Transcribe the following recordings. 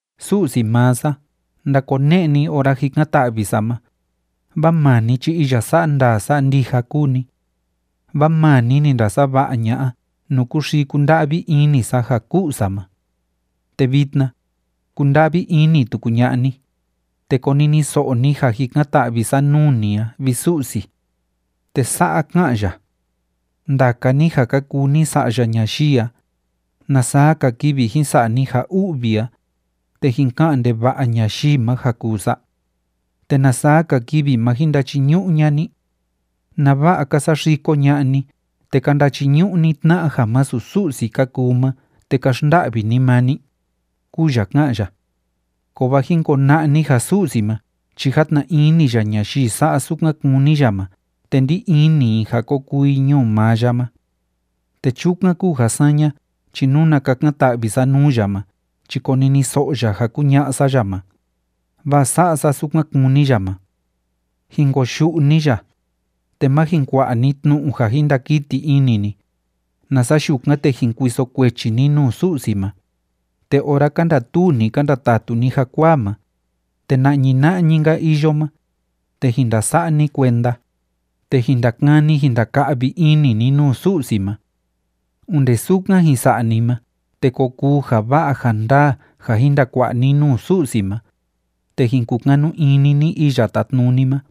Su'si maa sa, ndakone'e ni ora jikan‑ta'vi sa ma, vaa maa ni chi iya sa'a ndaa sa'a ndija kúu ni. Vaa maa ni ni ndasava'a ña'a nuu kúxii kúnda'vi ini sa ja ku'u sa ma. Te vitna, kunda'vi ini tuku ña'a ni, te koniniso'o ni ja jikan‑ta'vi sa nuu ni a, vi Su'si. Te sa'a ká'an ya: “Ndaka ni ja ka kuu ni sa'ya ñayii a, ¿Na saa‑ka kivi jin sa'a ni ja u'vi a, te jin ka'an ndeva'a ñayii ma ja kuu sa? ¿Te na saa‑ka kivi, ma jin ndachiñu'u ña'a ni? ¿Nava'a ka saxiko ña'a ni te ka ndachiñu'u ni tna'a ja masu Su'si ka kuu ma te ka xnda'vi ni maa ni?”, kúu ya ká'an ya. Kovaa jin kona'a ni ja Su'si ma chi játna ini ya ñayii sa'a sukan kúni ya ma te ndí ini i ja ko kuu i ñuu maa ya ma. Te chukan kúu ja saña chi nuna kakan‑ta'vi sa nuu ya ma chi koniniso'o ya ja kuña'a sa ya ma, vaa sa'a sa sukan kúni ya ma. Jin koyu'u ni ya, te má jin kua'a ni tnu'u ja jin ndakiti ini ni, nasa yukan, te jin kuiso kuechi ni nuu Su'si ma. Te ora ka ndatuu ni ka ndatatu ni jakuaa ma, te na'ñi na'ñi‑nka iyo ma, te jin ndasa'a ni kuenda, te jin ndakani jin ndaka'vi ini ni nuu Su'si ma. Onde sukan jin sa'a ni ma, te ko kuu ja va'a ja ndaa ja jin ndakua'a ni nuu Su'si ma, te jin kukanu ini ni Iya Tátnuni ma.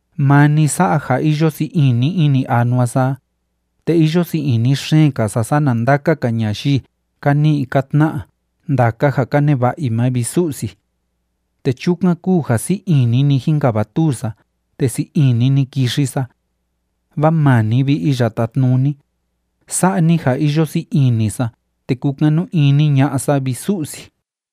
Maa ni sa'a ja iyo sii ini ini anua sa a, te iyo sii ini xeen‑ka sa sana ndaka‑ka ñayii ka ni'i ka tna'a ndaka ja ka neva'a i ma, vi Su'si. Te chukan kúu ja sii ini‑ni jínkavatuu sa te sii ini‑ni kixi sa. Vaa maa ni, vi Iya Tátnuni, sa'a ni ja iyo sii ini sa te kúkanu ini ña'a sa, vi Su'si.